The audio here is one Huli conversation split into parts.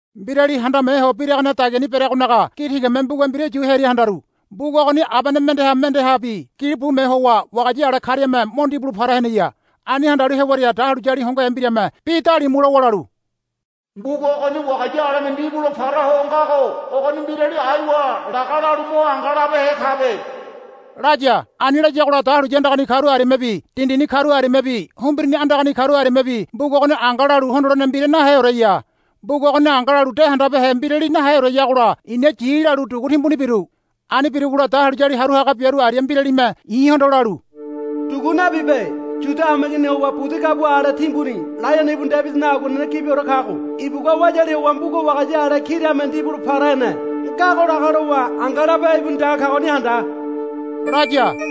Mbirali handame ho biragane dagiani bereagonaga gi tigame mbuga mbira yu hearia handaru. Mbuga ogoni abene mendeha mendehabi gili bume howa wagaya ale kariame mo ndibulo para heneya. Ani handalu hewaria dahuliyali hongohe mbirame bi dalimu lowa lalu, Mbuga ogoni wagaya aleme ndibulo para ho ngago ogoni mbirali aiwa laga lalu mo anga labehe kabe, laya. Ani layagola dahuliya andagani karu ariamebi dindini karu ariamebi humbirini andagani karu ariamebi mbuga ogoni anga lalu hondolene mbira naheoreya. Mbuga ogoni anga lalu de handabehe mbirali naheoreyagola i̱na yi lalu dugu timbuni biru. Ani birugola dahuliyali haru haga biaru aria mbiralime i̱hondo lalu, Dugu nabibe. Yuda hameiginiha howa budi gabua ale timbuni Laiono ibu Debidinaga aguanene gibiore kago ibugua wayali howa mbuga wagaya ale kariame ndibulo para hene ngago laga lowa anga labehe ibuni dege kagoni handa, laya.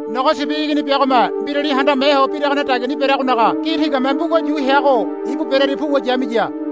Nogo Sibi Igini biagome mbirali handame ho biragane dagiani bereagonaga gi tigame mbuga yu heago ibu berearia puwa yamiya.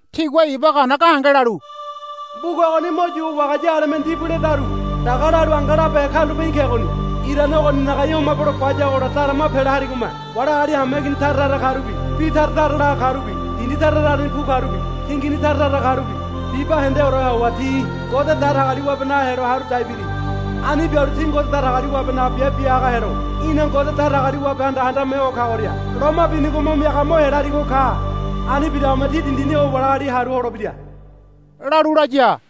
Tigua iba gana gahenge lalu, Mbuga ogoni mo yuwa wagaya aleme ndibuledaru laga lalu anga labehe karulape í̠ kegoni. Irane ogoninaga í̠ homabelo bayagola darama pela harigome wali agali hameigini tara tara karubi bi tara tara laga karubi dindi tara tarani bu karubi tingini tara tara karubi bibahendeoreha howa ti Ngode Datagaliwabenaga helo haru dai biri. Ani bialu ti Ngode Datagaliwabenaga biabe biaga helo í̠na Ngode Datagaliwabehanda handame ho kagoria loma binigo mo miaga mo hela harigo ka. Ani biragome ti dindini howa wali agali haru holebira, lalu laya.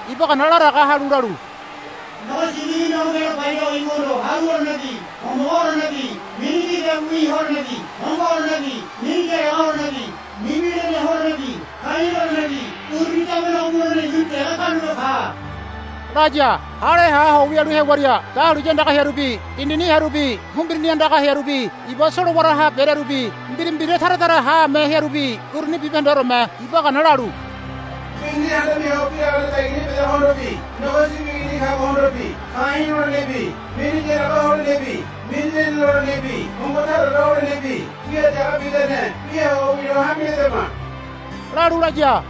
iba gana laraga halu lalu, Nogo Sibi Igini homelo bayago ibuhondo haru holenebi homogo holenebi mini gigabiwi holenebi hongo holenebi mini yaraga holenebi mini lene holenebi ka̱i̱ lolenebi uruni damenego mulene ibuni dege karulape ka, laya. Hale ha ho wialu hewaria dahuliya andaga hearubi dindini hearubi humbirini andaga hearubi iba solowaraha berearubi mbira mbira tara tara haame hearubi uruni bibahendeoreme iba gana lalu, Mbirali handame ho biragane dagiani bedagohondobi Nogo Sibi Igini kagohondobi ka̱i̱ lolenebi mini yaraga holenebi mini lene lolenebi hongo taraore holenebi wia dege bidane wia ho wilo hame ledama, lalu laya.